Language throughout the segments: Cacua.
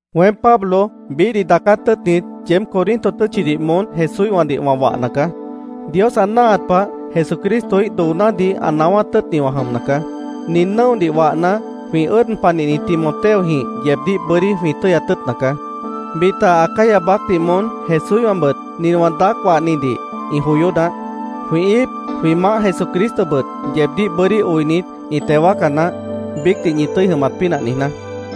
Weém, Pablo, biíhdih daacát tʉ́ʉtnit, yeéb Corinto tʉ́tchidih moón Jesúíhwãdih wã wahna caá. Dios ã náahat pah, Jesucristoíh doonádih ã naáwát tʉ́ʉtni wã jʉmna caá. Nin nʉ́odih wahna, jwĩ ʉ́ʉd panihni Timoteojĩh yeebdíh bʉ́dí jwĩ tʉ́yat tʉ́ʉtna caá. Bita Acaya baácdih moón Jesúíhwãbʉt nin wã daác wahnidih ĩ joyó naáh. Jwĩ íip, jwĩ Maáh Jesucristobʉt yeebdíh bʉ́dí oinit, ĩ teo wáaca naáh, biícdih ñi tʉ́i jʉmat pínah niijná.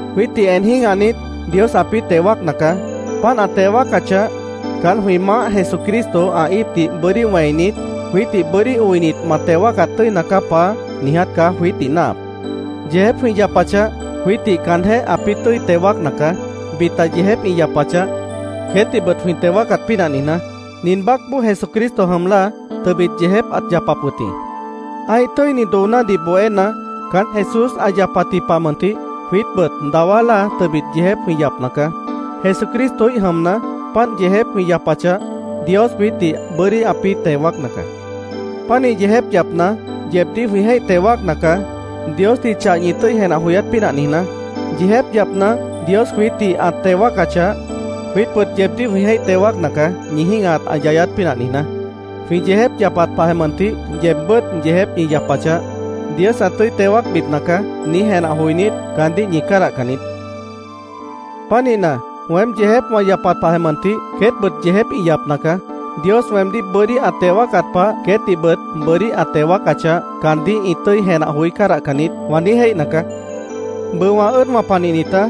Jwiítdih en jĩ́gahnit, Dios ãpĩ́ teo wáacna caá. Páant ã teo wáacachah, caán, jwĩ Maáh Jesucristo ã íipdih bʉ́dí wẽinit, “Jwiítdih bʉ́dí oinit, ma teo wáacat tʉ́ina caá, Paá”, niiját caá jwiítdih náahap. Yeejép jwĩ yapachah, jwiítdih caanjéh ãpĩ́ tʉ́i teo wáacna caá, bita yeejép ĩ yapachah, queétdihbʉt jwĩ teo wáacat pínah niijná. Nin baácboó Jesucristo jʉm láa, tʉbit yeejép ãt yapap wʉt jĩ. Ã́ih tʉ́ini doonádih bohéna, caán Jesús ã yapatji pah mʉntih jwiítbʉt dawá láa tʉbit yeejép jwĩ yapna caá. Jesucristoíh jʉmna, páant yeejép jwĩ yapachah, Dios jwiítdih bʉ́dí ãpĩ́ teo wáacna caá. Pánih yeejép yapna, yeebdíh jwĩ jéih teo wáacna caá, Diosdih chah ñi tʉ́i jenah joyát pínah niijná. Yeejép yapna, Dios jwiítdih ã teo wáacachah, jwiítbʉt yeebdíh jwĩ jéih teo wáacna caá, ñi jĩ́gahat ã yayát pínah niijná. Jwĩ yeejép yapat pahjeh mʉntih, yeebbʉ́t yeejép ñi yapachah, “Dios ã tʉ́i teo wáacbipna caá”, niíj jenah joinít, caandíh ñi cádahcan niít. Pánihna, “Weém yeejép wã yapat pahjeh mʉntih, queétbʉt yeejép ĩ yapna caá. Dios weemdíh bʉ́dí ã teo wáacat pah, queétdihbʉt bʉ́dí ã teo wáacachah, caandíh ĩ tʉ́i jenah joí cádahcan niít”, wã niíj jéihna caá. Bʉʉ wã ʉ́ʉdwã panihnitá,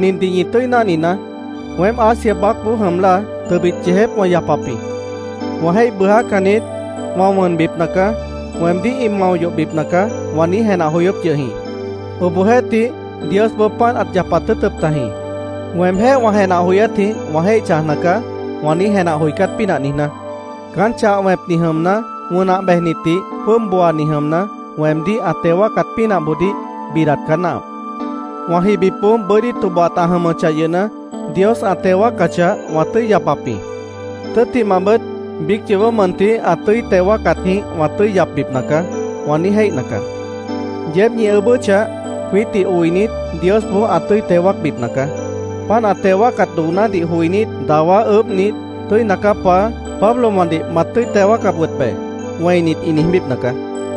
nindih ñi tʉ́i náhninaá: Weém Asia baácboó jʉm láa, tʉbit yeejép wã yapap jĩ. “Wã jéih bʉʉjácan niít. Wã wʉnbipna caá. Weemdíh ĩ mao yohbipna caá”, wã niíj jenah joyóp yʉh jĩ. Obohjeéhtih, Diosboó páant ãt yapat tʉ́ʉtʉp tajĩ, “Weemjéh wã jenah joyátjĩh wã jéih chãjna caá”, wã niíj jenah joicát pínah niijná. Caán, chah wẽpni jʉmna, wʉnah bejnitdih jwʉ́ʉb booani jʉmna, weemdíh ã teo wáacat pínahboodíh bidat caá náahap. “Wã jibipboó bʉ́dí tobohat ã jʉmʉchah yʉhna, Dios ã teo wáacachah, wã tʉ́i yapap jĩ. Tʉ́ttimahbʉt, biíc yoobó mʉntih ã tʉ́i teo wáacatjĩh wã tʉ́i yapbipna caá”, wã niíj jéih caá. Yeéb ñi ʉʉ́bʉ́chah, jwiítdih oinit, Diosboó ã tʉ́i teo wáacbipna caá. Páant ã teo wáacat doonádih joinít, dawá ʉʉ́bhnit, “Tʉ́ina caá, Paá. Pablowãdih mat tʉ́i teo wáacap wʉt be”, wẽinit, ĩ niijbípna caá.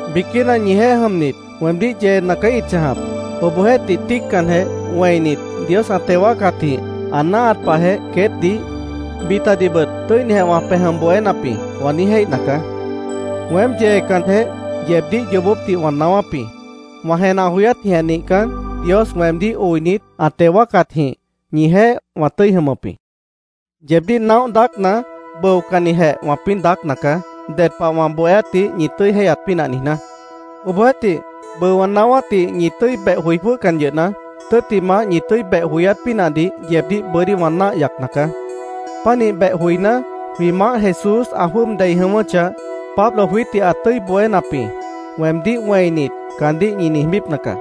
Biquína ñijeéh jʉmnit weemdíh yeena caá ĩt chãjap. Obohjeéhtih, tíiccanjeh, wẽinit, “Dios ã teo wáacatjĩh ã náahat pahjeh queétdih, bitadihbʉt tʉ́inijeh wã pej jʉm bohénap jĩ”, wã niíj jéihna caá. Weém yeecanjeh, yeebdíh yoobópdih wã naáwáp jĩ. Wã jenah joyátjĩh nihcan, Dios weemdíh oinit, ã teo wáacatjĩh, ñijeéh wã tʉ́i jʉmʉp jĩ. Yeebdíh naóh daácna, bʉocannijeh wãpĩ́ daácna caá, ded pah wã bohéátdih ñi tʉ́i jéihyat pínah niijná. Obohjeéhtih, bʉʉ wã naáwátdih ñi tʉ́i beh joi jwʉ́hcan yʉhna, tʉ́ttimah, ñi tʉ́i beh joyát pínahdih yeebdíh bʉ́dí wã náah yacna caá. Pánih beh joiná, jwĩ Maáh Jesús ã jwʉ́ʉb dei jʉ̃ʉ́wʉ́chah, “Pablo jwiítdih ã tʉ́i bohénap jĩ”, weemdíh wẽinit, caandíh ñi niijbípna caá.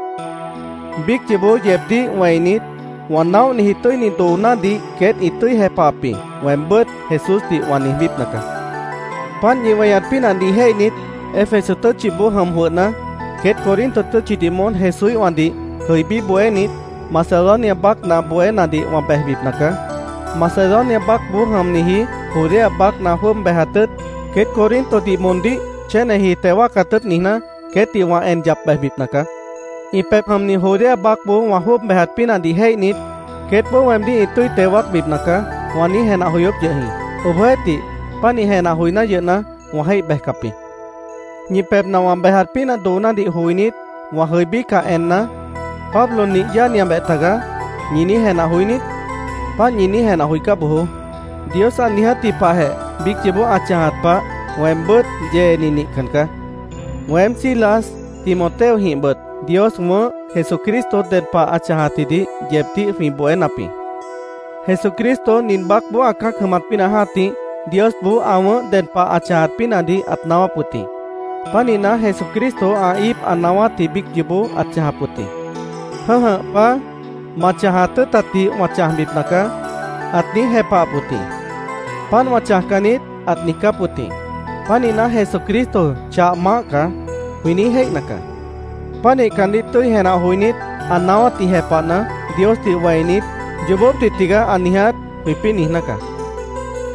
Biíc yoobó yeebdíh wẽinit, “Wã naóhniji tʉ́ini doonádih queét ĩ tʉ́i jepahap jĩ”, weembʉ́t Jesúsdih wã niijbípna caá. Páant ñi weñat pínahdih jéihnit, Éfeso tʉ́tchiboó jʉm jwʉhna, “Queét Corinto tʉ́tchidih moón Jesúíhwãdih jʉibí bohénit, Macedonia baácna bohénadih wã bejbipna caá. Macedonia baácboó jʉmniji Judea baácna jwʉ́ʉb bejat tʉ́ʉt, queét Corintodih moondíh chéneji teo wáacat tʉ́ʉt niijná, queétdih wã en yap bejbipna caá. Ĩ pebh jʉmni Judea baácboó wã jwʉ́ʉb bejat pínahdih jéihnit, queétboó weemdíh ĩ tʉ́i teo wáacbipna caá”, wã niíj jenah joyóp yʉh jĩ. Obohjeéhtih, pánih jenah joiná yʉhna, wã jéih bejcap jĩ. Ñi pebhna wã bejat pínah doonádih joinít, wã jʉibícah enna, “Pablo nih yáaniabeh tagaá”, ¿ñi niíj jenah joí niít? Páant ñi niíj jenah joicá bojoó. Dios ã niijátji pahjeh biíc yoobó ã chãjat pah, weembʉ́t yeeni nihcan caá. Weém, Silas, Timoteojĩhbʉt Dios wʉ̃ʉ́h Jesucristo ded pah ã chãjatjidih yeebdíh jwĩ bohénap jĩ. Jesucristo nin baácboó ã cã́ac jʉmat pínah jã́tih, Diosboó ã wʉ̃ʉ́h ded pah ã chãjat pínahdih ãt naáwáp wʉt jĩ. Pánihna, Jesucristo ã íip ã naáwátji biíc yoobó ãt chãjap wʉt jĩ. “Jʉ̃́jʉh Paá, ma chãjat tʉ́ʉtatdih wã chãjbipna caá”, ãt niíj jepahap wʉt jĩ. “Páant wã chãjcan niít”, ãt niijcáp wʉt jĩ. Pánihna, “Jesucristo chah Maáh caá”, jwĩ niíj jéihna caá. Pánih caandíh tʉ́i jenah joinít, ã naáwátdih jepahna, Diosdih wẽinit, “Yoobópdih tigaá ã niiját”, jwĩpĩ́ niijná caá.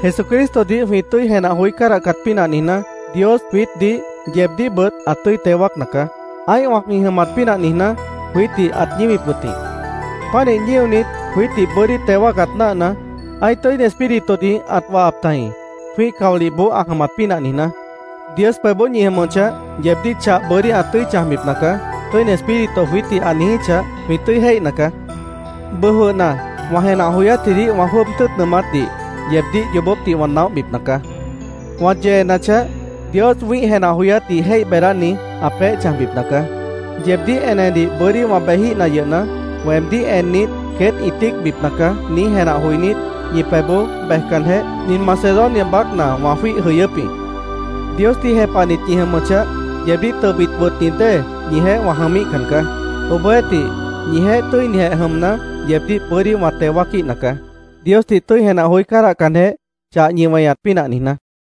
Jesucristodih jwĩ tʉ́i jenah joí cádahcat pínah niijná, Dios jwiítdih, yeebdíhbʉt ã tʉ́i teo wáacna caá. Ã́ihwã jwĩ jʉmat pínah niijná, jwiítdih ãt ñíwip wʉt jĩ. Pánih ñíonit, jwiítdih bʉ́dí teo wáacat náahna, ã́ih Tʉ́ini Espíritudih ãt wahap tajĩ, jwĩ́ih caolihboó ã jʉmat pínah niijná. “Dios pebhboó ñi jʉmʉchah, yeebdíh chah bʉ́dí ã tʉ́i chãjbipna caá”, Tʉ́ini Espíritu jwiítdih ã niijíchah, jwĩ tʉ́i jéihna caá. Bʉʉ jwʉhna, wã jenah joyátjidih wã jwʉ́ʉb tʉ́ʉt nʉʉmátdih yeebdíh yoobópdih wã naóhbipna caá. Wã yeenachah, Dios wĩ́ih jenah joyátdih jéih beedáni, ã peéh chãjbipna caá. Yeebdíh enedih bʉ́dí wã bejíhna yʉhna, “Weemdíh ennit, queét ĩ tíicbipna caá”, niíj jenah joinít, ñi pebhboó bejcanjeh, nin Macedonia baácna wã jwíih jʉyʉ́p jĩ. Diosdih jepahnit ñi jʉmʉchah, yeebdíh tʉbit wʉtni dée ñijeéh wã jʉmíhcan caá. Obohjeéhtih, ñijeéh tʉ́inijeh jʉmna, yeebdíh bʉ́dí wã teo wáaquíhna caá, Diosdih tʉ́i jenah joí cádahcanjeh, chah ñi weñat pínah niijná.